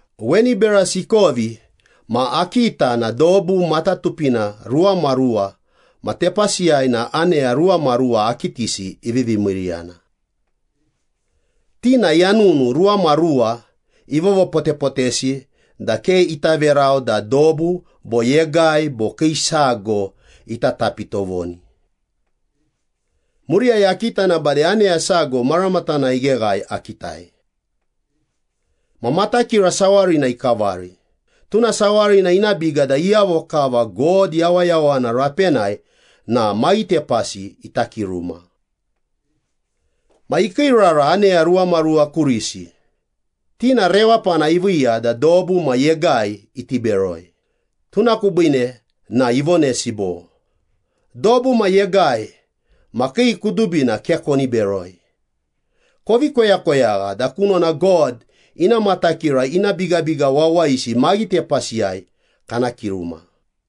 Weni berasi ikovi ma akita na dobu matatupina ruwamaruwa ma tepasiyai na aneya ruwamaruwa akitisi ivivi miiriyana. Ti na yanunu ruwamaruwa ivovopotepotesi da ke ita verau da dobu bo yegai bo kii sago ita tapi tovoni. Muriyai akita na bade aneya sago maramatanai igheghae akitai. Ma matakira sawarina ikavari, tuna sawarina ina biga da iyavo kava God yawayawana rapenai na maghitepasi ita kiruma. Ma ikiirara aneya ruwamaruwa kurisi, ti na rewapana iviiya da dobu ma yegai iti beroi, tuna kubiine na ivonesi bo, “Dobu ma yegai ma kii kudubina ke koni beroi, kovi koyakoyagha da kunona God ina matakira ina bigabiga wawayisi maghitepasiyai kana kiruma.”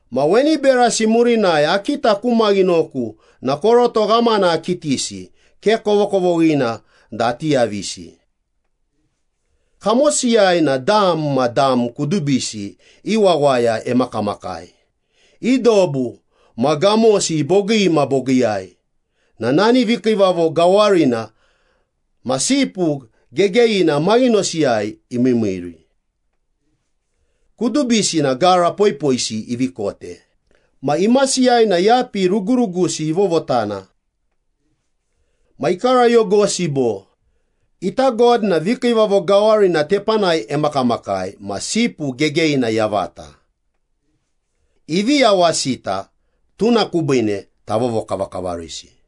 Ma weni berasi murinai akita ku maghinoku na koroto ghamana akitisi, ke kovokovoghina da ati yavisi. Kamosiyai na dam ma dam kudubisi i wawaya emakamakai, i dobu ma gamosi bogii ma bogiiyai na nani vikiivavo gawarina ma Sipu Gegeyina maghinosiyai imiimiiri. Kudubisi na gara poipoisi ivi kote ma imasiyai na yapi rugurugusi ivovotana. Ma ikarayogosi bo, “Ita God na vikiivavo gawarina tepanai emakamakai ma Sipu Gegeyina yavata. Ivi yawasita, tuna kubiine tavovokavakavarisi.”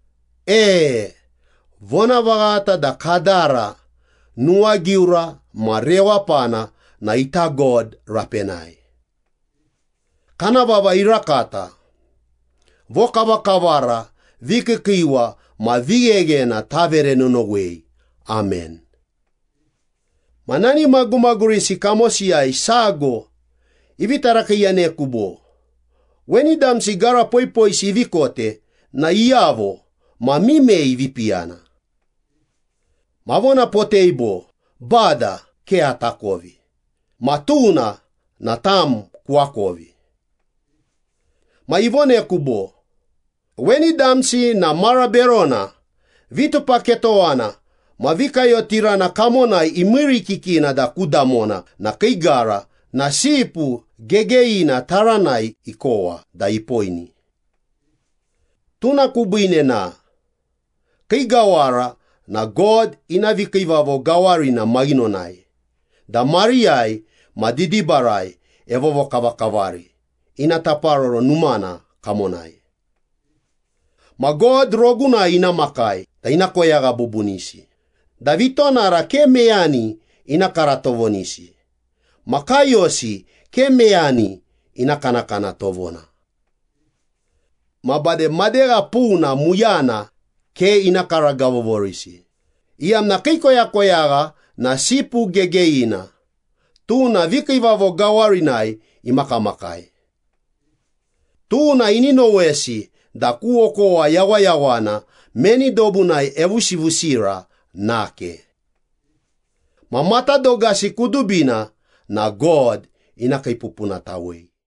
“E, vonavaghata da kadara, nuwagiura ma rewapana na ita God rapenai. Kana vava irakata. Vokavakavara, vikiikiiwa ma vigheghena tavere nonowei. Amen.” Ma nani magumagurisi kamosiyai sago ivi tarakiiyaneku bo, “Weni damsi gara poipoisi ivi kote na iyavo ma mimei ivi piyana?” Avonapotei bo, “Bada, ke atakovi ma tuna na tam kuakovi.” Ma ivoneku bo, “Weni damsi na mara berona, vitupaketowana ma vikayotirana kamonai imiirikikina da ku damona na kii gara na Sipu Gegeyina taranai ikowa da ipoini. Tuna kubiine na, ‘Kii gawara na God ina vikiivavo gawarina maghinonai da mariyai ma didibarai evovokavakavari ina taparoro numana kamonai. Ma God rogunai ina makai da ina koyagha bubunisi, da vitonara ke meyani ina kara tovonisi, ma kaiyosi ke meyani ina kanakana tovona. Ma bade madegha puna muyana ke ina karagavovorisi, iyamna kii koyakoyagha na Sipu Gegeyina, tuna vikiivavo gawarinai imakamakai. Tuna ini nowesi da ku okowa yawayawana meni dobunai evusivusira nake. Ma matadogasi kudubina na God ina kiipupunatawei.’”